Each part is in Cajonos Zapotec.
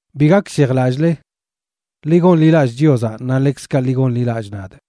Bi gakshejlallꞌle. Ḻi gonḻilallꞌ Chiozaꞌ naꞌ ḻekzkaꞌ ḻi gonḻilallꞌ nadꞌ.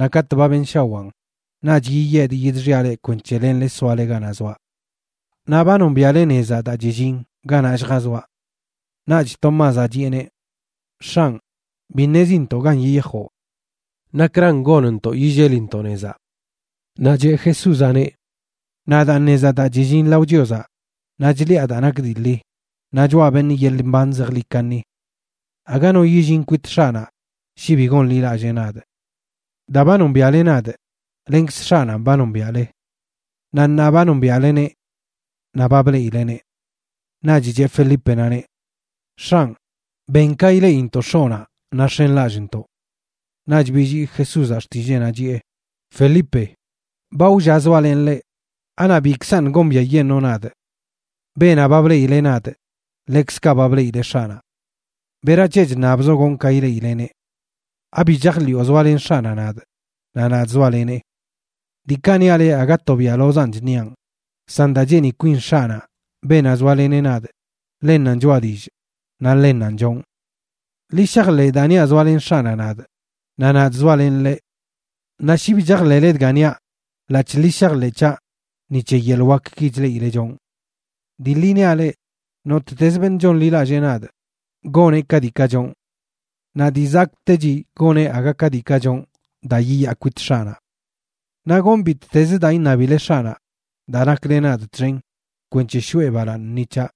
Naꞌ katꞌ ba benshawaan, naꞌch yiyedꞌ yidxiaꞌ leꞌ kwenc̱he lenle soale ganaꞌ zoaꞌ. Naꞌ ba nombiaꞌle nezaꞌ daa chillin ganaꞌ lljazoaꞌ. Naꞌch Tomázaꞌ chiꞌeneꞌ: ―X̱anꞌ, bi ṉezintoꞌ gan yiyajoꞌ. ¿Nakran gonntoꞌ yillelintoꞌ nezaꞌ? Naꞌ cheꞌ Jesúzaꞌneꞌ: ―Nadaanꞌ nezaꞌ daa chillin lao Chiozaꞌ, naꞌ chliꞌa daa nak dii ḻi, naꞌ choꞌa beṉꞌ yeḻꞌ mban zejḻi kaṉi. Aga no yillin kwit X̱aꞌnaꞌ shi bi gonḻilallee nadꞌ. Daa ba nombiaꞌle nadꞌ, lenkz X̱aꞌnanꞌ ba nombiaꞌle. Naꞌ ṉaa ba nombiaꞌleneꞌ naꞌ ba bleꞌileneꞌ. Naꞌch cheꞌ Felípenaꞌneꞌ: ―X̱anꞌ, ben ka ileꞌintoꞌ X̱oꞌnaꞌ naꞌ x̱enlallꞌntoꞌ. Naꞌch billii Jesúzaꞌ xtilleenaꞌ, chiꞌe: ―Felipe, ba wlla zoalenꞌ leꞌ, ¿anaꞌ bikzaṉꞌ gombiaꞌyeṉoo nadꞌ? Beenaꞌ ba bleꞌileꞌ nadꞌ ḻekzkaꞌ ba bleꞌileꞌ X̱aꞌnaꞌ. ¿Berac̱he chṉabzoꞌ gonꞌ ka ileꞌileneꞌ? ¿Abi chajḻiꞌo zoalen X̱aꞌnaꞌ nadꞌ naꞌ nadꞌ zoalenee? Diikaꞌ niaꞌ leꞌ aga to biaꞌlozanꞌ chṉiaꞌn, san daa cheeni kwin X̱aꞌnaꞌ, beenaꞌ zoaleneꞌ nadꞌ, ḻennanꞌ choꞌa dillꞌ naꞌ ḻennanꞌ chonꞌ. Ḻi shajḻeꞌ daa niaꞌ zoalen X̱aꞌnaꞌ nadꞌ, naꞌ nadꞌ zoalenꞌ ḻeꞌ. Naꞌ shi bi chajḻeꞌle dga niaꞌ, ḻaꞌc̱hꞌ ḻi shajḻeꞌ c̱haꞌ ni c̱he yeḻꞌ wakki chleꞌileꞌ chonꞌ. Dii ḻi niaꞌ leꞌ, nottez beṉꞌ chonḻilallee nadꞌ, goneꞌ ka diikaꞌ chonꞌ. Naꞌ dii zakꞌtechi goneꞌ aga ka diikaꞌ chonꞌ, daa yiyaa kwit X̱aꞌnaꞌ. Naꞌ gonꞌ bittez daa iṉabile X̱aꞌnaꞌ daa nakle nadꞌ txen kwenc̱he shoꞌe balaaṉ ni c̱haꞌ.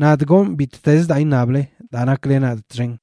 Nadꞌ gonꞌ bittezə daa iṉable daa nakle nadꞌ txen.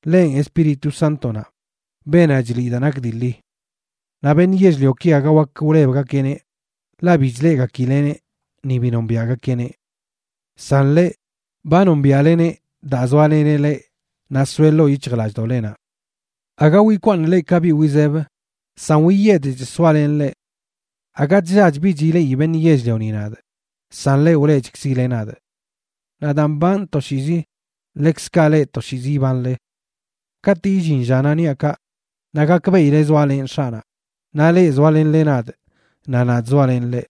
Ḻenꞌ Espíritu Sántonaꞌ, beenaꞌ chliꞌ daa nak dii ḻi. Naꞌ beṉꞌ yell-lioki aga wak wlebgakeꞌneꞌ, ḻaꞌ bi chleꞌgakileꞌneꞌ ni bi nombiaꞌgakeꞌneꞌ. San leꞌ, ba nombiaꞌleneꞌ daa zoaleneꞌ leꞌ naꞌ soeꞌ ḻoo yic̱hjlallꞌdoꞌlenaꞌ. Aga wikwaaṉꞌ leꞌ ka biꞌ wizeb, san wiyedchꞌ soalenꞌ leꞌ. Aga chllach bich ileꞌi beṉꞌ yell-lioni nadꞌ, san leꞌ wleꞌchkzile nadꞌ. Naꞌ daa mbanꞌ toshiizi, ḻekzkaꞌ leꞌ toshiizi ibanle. Katꞌ illin llanaꞌ niaꞌ kaꞌ, naꞌ gakbeꞌile zoalenꞌ X̱aꞌnaꞌ, naꞌ leꞌ zoalenle nadꞌ naꞌ nadꞌ zoalenꞌ leꞌ.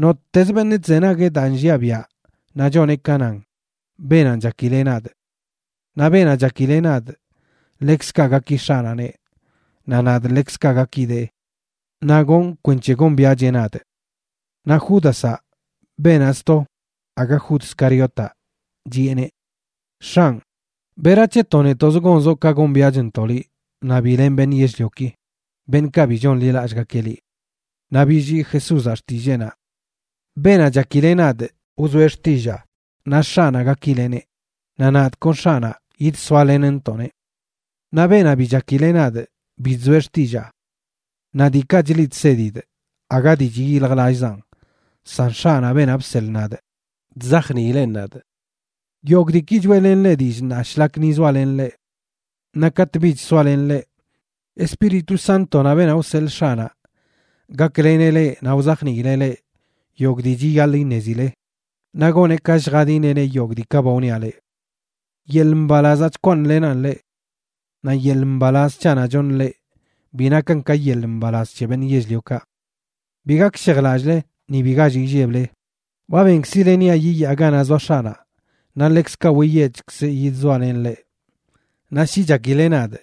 Nottez beṉꞌ chzenagueꞌ daa nlliaꞌ biaꞌ naꞌ choneꞌ ka nan, beenanꞌ chakileꞌ nadꞌ. Naꞌ beenaꞌ chakileꞌ nadꞌ, ḻekzkaꞌ gaki X̱aꞌnaꞌneꞌ, naꞌ nadꞌ ḻekzkaꞌ gakidee naꞌ gonꞌ kwenc̱he gombiaꞌcheꞌ nadꞌ. Naꞌ Júdazaꞌ (beenaꞌ sto, aga Jud Scariotaꞌ,) chiꞌeneꞌ: ―X̱anꞌ, ¿berac̱he to netoꞌz gonzoꞌ ka gombiaꞌchntoꞌ liꞌ naꞌ bi len beṉꞌ yell-lioki, beṉꞌkaꞌ bi chonḻilallꞌgakeꞌ liꞌ? Naꞌ billii Jesúzaꞌ xtilleenaꞌ: ―Beenaꞌ chakileꞌ nadꞌ, wzoeꞌ xtillaa, naꞌ X̱aꞌnaꞌ gakileꞌneꞌ, naꞌ nadꞌ kon X̱aꞌnaꞌ yidsoalenntoꞌneꞌ. Naꞌ beenaꞌ bi chakileꞌ nadꞌ, bi chzoeꞌ xtillaa. Naꞌ diikaꞌ chliꞌ chsedidꞌ aga dii chyiljlallzaan, san X̱aꞌnaꞌ, beenaꞌ bseḻꞌ nadꞌ, chzajniileꞌn nadꞌ. ’Yogꞌ diiki choeꞌlenꞌ leꞌ dillꞌ ṉaa shlak ni zoalenꞌ leꞌ. Naꞌ katꞌ bich soaꞌ len leꞌ, Espíritu Sántonaꞌ, beenaꞌ wseḻꞌ X̱aꞌnaꞌ, gakleneꞌ leꞌ naꞌ wzajniileꞌ leꞌ yogꞌ dii chiyaḻꞌ iṉezile, naꞌ goneꞌ ka lljadinile yogꞌ diikaꞌ ba wniaꞌ leꞌ. ’Yeḻꞌ mbalazaꞌ chkwaaṉlenaꞌn leꞌ. Naꞌ yeḻꞌ mbalaz c̱haꞌnaꞌ choṉꞌ leꞌ bi nakan ka yeḻꞌ mbalaz c̱he beṉꞌ yell-liokaꞌ. Bi gakshejlallꞌle, ni bi gall illeble. Ba benkzile niaꞌ yiyaa ganaꞌ zoa X̱aꞌnaꞌ naꞌ ḻekzkaꞌ wiyedchkzꞌ yidzoalenꞌ leꞌ. Naꞌ shi chakile nadꞌ,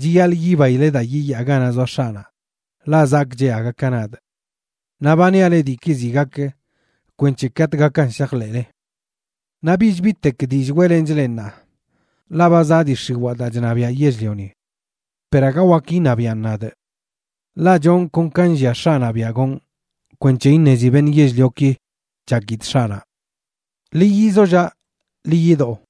chiyaḻꞌ yibaile daa yiyaa ganaꞌ zoa X̱aꞌnaꞌ, ḻaꞌ zakꞌcheꞌ aga ka nadꞌ. Naꞌ ba niaꞌ leꞌ diiki ziꞌ gak kwenc̱he katꞌ gakan shajḻeꞌle. ’Naꞌ bich bitek dillꞌ weꞌlenchꞌ leꞌ ṉaa, ḻaꞌ ba zaꞌ dii x̱iwaa, daa chṉabiaꞌ yell-lioni. Per aga wak iṉabiaꞌn nadꞌ. Ḻaꞌ chonꞌ kon ka nllia X̱aꞌnaꞌ biaꞌ gonꞌ kwenc̱he iṉezi beṉꞌ yell-lioki chakidꞌ X̱aꞌnaꞌ. Ḻi yizollaꞌ. Ḻi yidó.